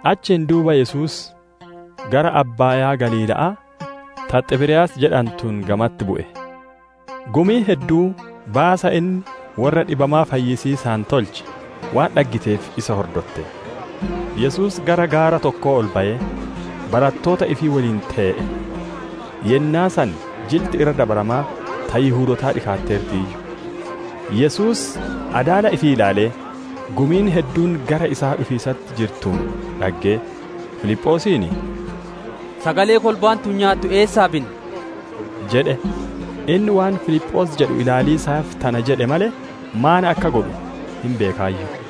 Achiin duuba Yesuus gara Abbaayaa Galiila'aa ta Xiberiyaas jedhantuun gamatti bu'e. Gumiin hedduun baasa inni worra dhibamaa fayyisiisaan tolche waan dhaggiteef isa hordotte. Yesuus gara gaara tokkoo ol bayee, barattoota ifii woliin tee'e. Yennaa san Jilti Irra Dabaramaa ta Yihudootaa dhikaatteertiiyyu. Yesuus adaala ifii ilaalee, gumiin hedduun gara isaa dhufiisatti jirtuun dhaggee, Filiphoosiin, «Sagalee kolbaan tun nyaattu eessaa binna?» jedhe. Inni waan Filiphoos jedhu ilaaliisaaf tana jedhe malee, maan akka godhu hin beekaayyu.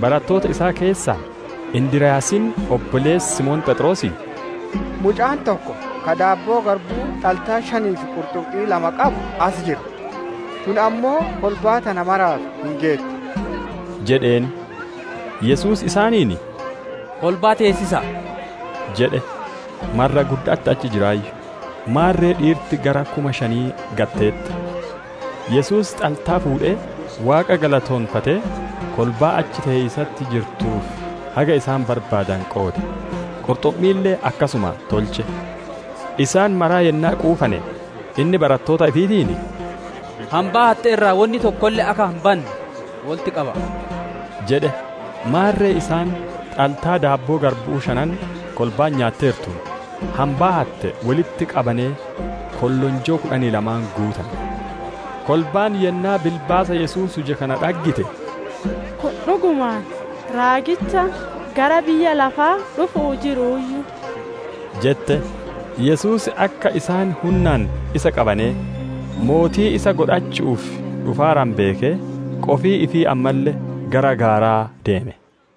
Barattoota isaa keessaa, Indiryaasiin obboleessi Simoon Pheexroosii, «Mucaan tokko ka daabboo garbu'uu xaltaa shanii fi qurxummii lama qabu as jira. Tun ammoo kolbaa tana maraaf hin geettu» jedheen. Yesuus isaaniin, «Kolbaa teessisa'a» jedhe. Marra gudda'atti achi jiraayyu; maarre dhiirti gara kuma shanii gad teteette. Yesuus xaltaa fuudhee, Waaqa galateeffatee, kolbaa achi tee'iisatti jirtuuf haga isaan barbaadane qoode; qurxummiille akkasuma tolche. Isaan mara yennaa quufane, inni barattoota ifiitiin, «Hambaa hatte irraa wonni tokkolle akka hin banne wolitti qaba'a» jedhe. Maarre isaan xaltaa daabboo garbu'uu shanan kolbaan nyaatteertuun, hambaa hatte wolitti qabanee kollonjoo kudhanii lama guutane. Kolbaan yennaa bilbaasa Yesuus huje kana dhaggite, «Kun dhugumaan raagicha gara biyya lafaa dhufu'uu jiruuyyu!» jette. Yesuus akka isaan hunnaan isa qabanee, mootii isa godhachu'uuf dhufaaranu beekee, qofii ifii ammalle gara gaaraa deeme.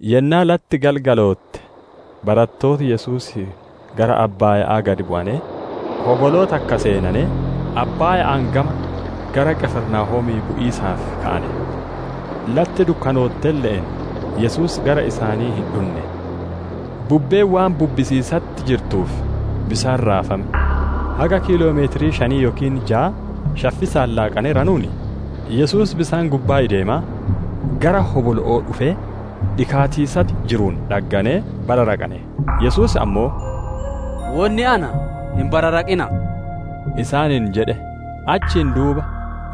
Yennaa latti galgalootte, barattooti Yesuusii gara abbaaya'aa gad bu'anee, hoboloo takka seenanee, abbaaya'aan gama gara Qifrinaahomii bu'iisaaf ka'ane. Latti dukkanoottelle'een Yesuus gara isaanii hin dhunne. Bubbeen waan bubbisiisatti jirtuuf bisaan raafame. Haga kiiloomeetira shanii yookiin jaa shaffisa'aan laaqaneeranuun, Yesuus bisaan gubbaa ideemaa, gara hobolo'oo dhufee dhikaatiisatti jiruun dhagganee bararaqane. Yesuus ammoo, «Wonni anaa, hin bararaqina'a!» isaaniin jedhe. Achiin duuba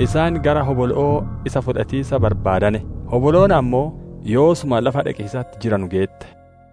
isaan gara hobolo'oo isa fudhatiisa barbaadane; hoboloon ammoo yoosuma lafa dhaqiisatti jiranu geette.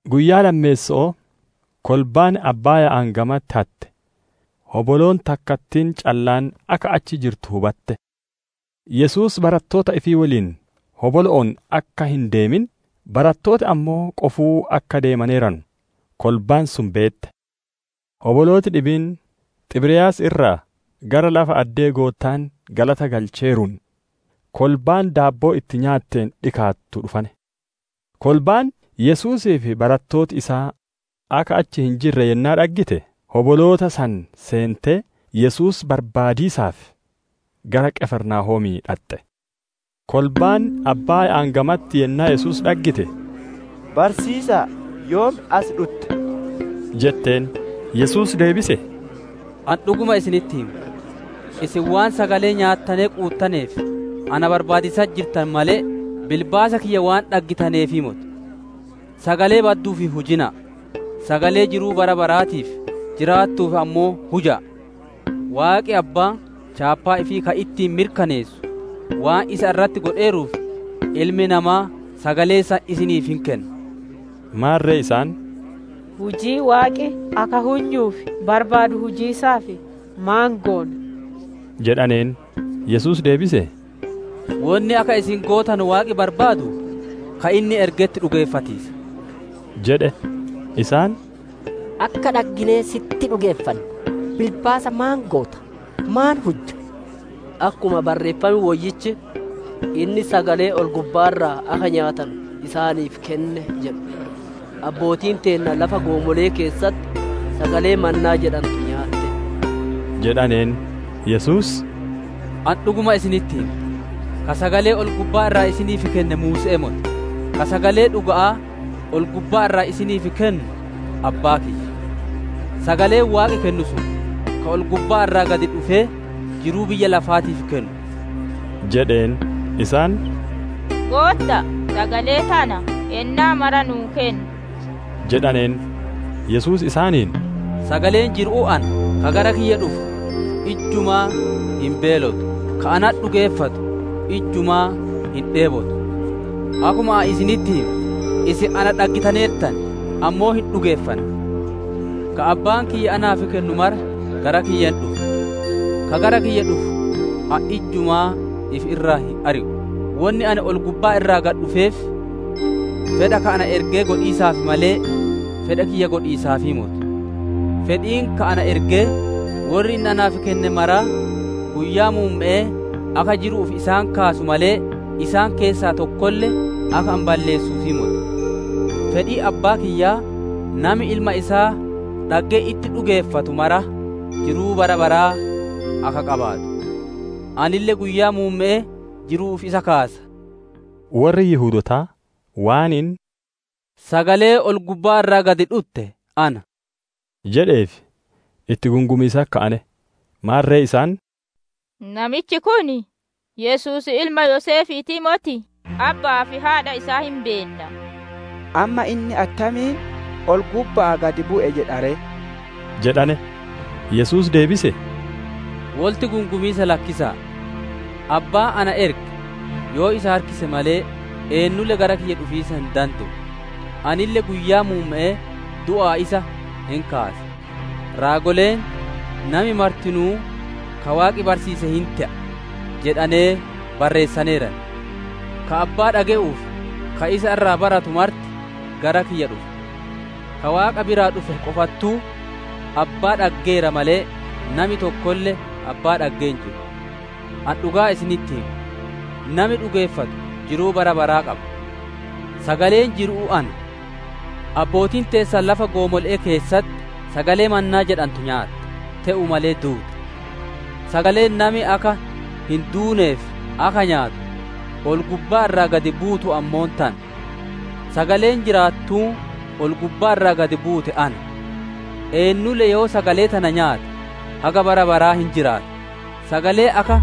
Guyyaa lammeesso'oo kolbaan abbaaya'aan gamatti hatte, hoboloon takkattiin callaan akka achi jirtu hubatte. Yesuus barattoota ifii woliin hobolo'oon akka hin deemin, barattooti ammoo qofuu akka deemaneeranu kolbaan sun beette. Hobolooti dhibiin, Xiberiyaas irraa, gara lafa addee Goottaan galata galcheeruun, kolbaan daabboo itti nyaatteen dhikaattuu dhufane. Kolbaan, Yesuusii fi barattooti isaa akka achi hin jirre yennaa dhaggite, hoboloota san seentee Yesuus barbaadiisaaf, gara Qifirnaahoomii dhaxxe. Kolbaan abbaaya'aan gamatti yennaa Yesuus dhaggite, «Barsiisa'a, yoom as dhutte?» jetteen. Yesuus deebisee, «Ani dhuguma isinitti hima; isin waan sagalee nyaattanee quuttaneef na barbaadiisatti jirtan malee, bilbaasa kiyya waan dhaggitaneefii moti. Sagalee badduuf hin hujina'a; sagalee jiruu bara baraatiif jiraattuuf ammoo huja'a. Waaqi Abbaan, chaappaa ifii ka ittiin mirkaneessu waan isa irratti godheeruuf, Ilmi Namaa sagalee san isiniif hin kenna» jedhe. Maarre isaan, «Hujii Waaqi akka hunyuuf barbaadu hujiisaaf maan goona?» jedhaneen. Yesuus deebisee, «Wonni akka isin gootanu Waaqi barbaadu, ka inni ergetti dhugeeffatiisa» jedhe. Isaan, «Akka dhagginee si'itti dhugeeffannu bilbaasa maan goota? Maan hujja? Akkuma Barreeffam Woyyichi, ‹Inni sagalee ol-gubbaa irraa akka nyaatanu isaaniif kenne› jedhu, Abbootiin teenna lafa goomole'ee keessatti sagalee mannaa jedhantu nyaatte» jedhaneen. Yesuus, «Ani dhuguma isinitti hima; ka sagalee ol-gubbaa irraa isiniif kenne Muuse'ee moti; ka sagalee dhuga'aa ol-gubbaa irraa isiniif kennu Abbaa kiyya. Sagaleen Waaqi kennu sun, ka ol-gubbaa irraa gad dhufee, jiruu biyya lafaatiif kennu» jedheen. Isaan, «Gootta'a, sagalee tana yennaa mara nu'uuf kenni» jedhaneen. Yesuus isaaniin, «Sagaleen jiru'uu ana; ka gara kiyya dhufu ijjumaa hin beelotu; ka natti dhugeeffatu ijjumaa hin dheebotu. Akkuma ani isinitti hime, isin na dhaggitaneertan; ammoo hin dhugeeffanne. Ka Abbaan kiyya naaf kennu mara gara kiyya hin dhufa. Ka gara kiyya dhufu ani ijjumaa ifi irraa hin ari'u. Wonni ani ol-gubbaa irraa gad dhufeef, fedha ka na ergee godhiisaaf malee, fedha kiyya godhiisaafii moti. Fedhiin ka na ergee, worri inni naaf kenne mara guyyaa muumme'ee akka jiru'uuf isaan kaasu malee, isaan keessaa tokkolle akka ani balleessuufii moti. Fedhiin Abbaa kiyyaa, nami Ilma isaa dhaggee itti dhugeeffatu mara jiruu bara baraa akka qabaatu. Anille guyyaa muumme'ee jiru'uuf isa kaasa» jedhe. Worri Yihudootaa waan inni, «Sagaleen ol-gubbaa irraa gad dhutte ana» jedheef itti gungumiisatti ka'ane. Maarre isaan, «Namichi kun Yesuusii ilma Yoseefiitii moti? Abba'aa fi haadha isaa hin beenna. Amma inni attamiin, ‹Ol-gubba'aa gad bu'e› jedha ree?» jedhane. Yesuus deebisee, «Wolitti gungumiisa lakkisa'a. Abbaan na erge yoo isa harkise malee, eennulle gara kiyya dhufiisa hin dande'u; anille guyyaa muumme'ee du'aa isa hin kaasa. Raagoleen, ‹Nami martinuu ka Waaqi barsiise hin te'a› jedhanee barreessaneeran. Ka Abbaa dhage'uu fi ka isa irraa baratu marti gara kiyya dhufa. Ka Waaqa biraa dhufe qofattuu Abbaa dhaggeera male, nami tokkolle Abbaa dhaggee hin jiru. Ani dhugaa isinitti hima; nami dhugeeffatu jiruu bara baraa qaba. Sagaleen jiru'uu ana. Abbootiin teessan lafa goomole'ee keessatti sagalee mannaa jedhantu nyaatte; te'uu male duute. Sagaleen nami akka hin duuneef akka nyaatu, ol-gubbaa irraa gad buutu ammoo tana. Sagaleen jiraattuun ol-gubbaa irraa gad buute ana. Eennulle yoo sagalee tana nyaate, haga bara baraa hin jiraata. Sagaleen akka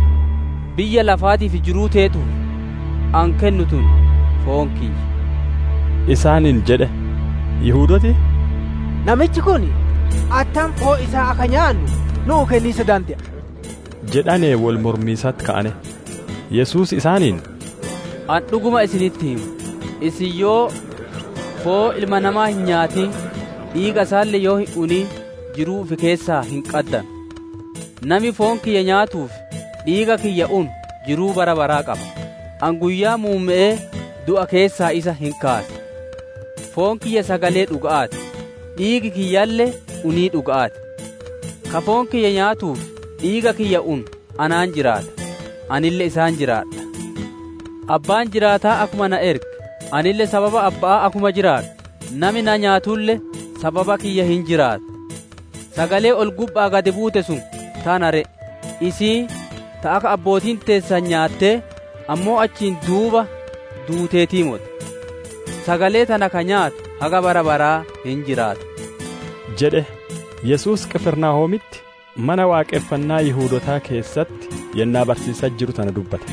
biyya lafaatiif jiruu teetuuf, ani kennu tun, foon kiyya» isaaniin jedhe. Yihudooti, «Namichi kun attam foon isaa akka nyaannu nu'uu kenniisa dande'a?» jedhanee wol mormiisatti ka'ane. Yesuus isaaniin, «Ani dhuguma isinitti hima: isin yoo foon Ilma Namaa hin nyaatin, dhiiga isaalle yoo hin unin, jiruu ifi keessaa hin qaddanu. Nami foon kiyya nyaatuu fi dhiiga kiyya unu jiruu bara baraa qaba; Ani guyyaa muumme'ee du'a keessaa isa hin kaasa. Foon kiyya sagalee dhuga'aa ti; dhiigi kiyyalle unii dhuga'aa ti. Ka foon kiyya nyaatuu fi dhiiga kiyya unu anaan jiraata; Anille isaan jiraadha. Abbaan jiraataan akkuma na erge, Anille sababa Abba'aa akkuma jiraadhu, nami na nyaatulle sababa kiyya hin jiraata. Sagaleen ol-gubba'aa gad buute sun tana ree; isiin ta akka abbootiin teessan nyaattee, ammoo achiin duuba duuteetii moti. Sagalee tana ka nyaatu haga bara baraa hin jiraata» jedhe. Yesuus Qifirnaahoomitti Mana Waaqonfannaa Yihudootaa keessatti yennaa barsiisiisatti jiru tana dubbate.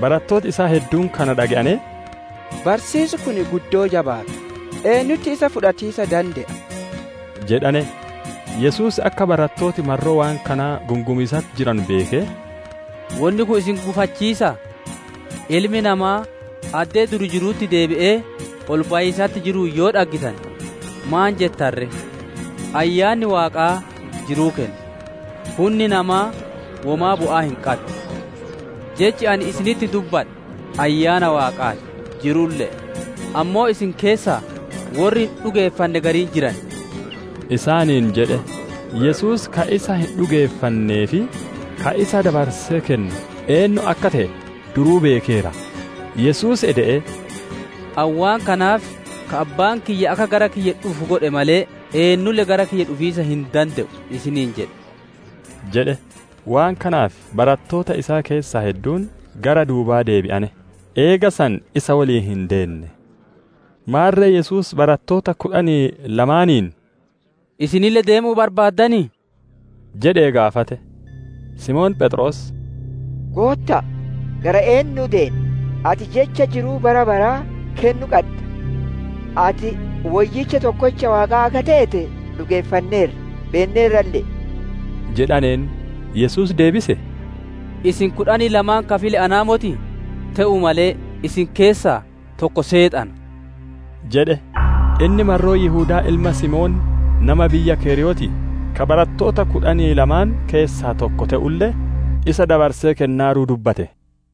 Barattooti isaa hedduun kana dhage'anee, «Barsiisi kun guddoo jabaata. Eennutti isa fudhatiisa dande'a?» jedhane. Yesuus akka barattooti marroo waan kanaa gungumiisatti jiranu beekee, «Wonni kun isin gufachiisaa? Ilmi Namaa addee dur jirutti deebi'ee ol bayiisatti jiruun yoo dhaggitane maan jettan ree? Ayyaanni Waaqaa jiruu kenna; hunni namaa womaa bu'aa hin qaddu. Jechi ani isinitti dubbadhe Ayyaana Waaqaa ti; jiruulle'e. Ammoo isin keessaa worri hin dhugeeffanne gariin jiran» isaaniin jedhe. Yesuus ka isa hin dhugeeffannee fi ka isa dabarsee kennu eennu akka te'e duruu beekeera. Yesuus ede'ee, «Ani waan kanaaf ka Abbaan kiyya akka gara kiyya dhufu godhe malee, eennulle gara kiyya dhufiisa hin dande'u isiniin jedhe» jedhe. Waan kanaaf, barattoota isaa keessaa hedduun gara duubaa deebi'ane; eega san isa woliin hin deenne. Maarre Yesuus barattoota kudhanii lamaaniin, «Isinille deemuu barbaaddanii?» jedhee gaafate. Simoon Pheexroos, «Gootta'a, gara eennuu deenna? Ati Jecha jiruu bara baraa kennu qadda. Ati Woyyicha Tokkocha Waaqaa akka teete dhugeeffanneerra; beenneerralle'e» jedhaneen. Yesuus deebisee, «Isin kudhanii lamaan ka file anaa motii? Te'uu malee isin keessaa tokko Seexana» jedhe. Inni marroo Yihudaa ilma Simoonii nama biyya keriyootii, ka barattoota kudhanii lamaan keessaa tokko te'ulle, isa dabarsee kennaaruu dubbate.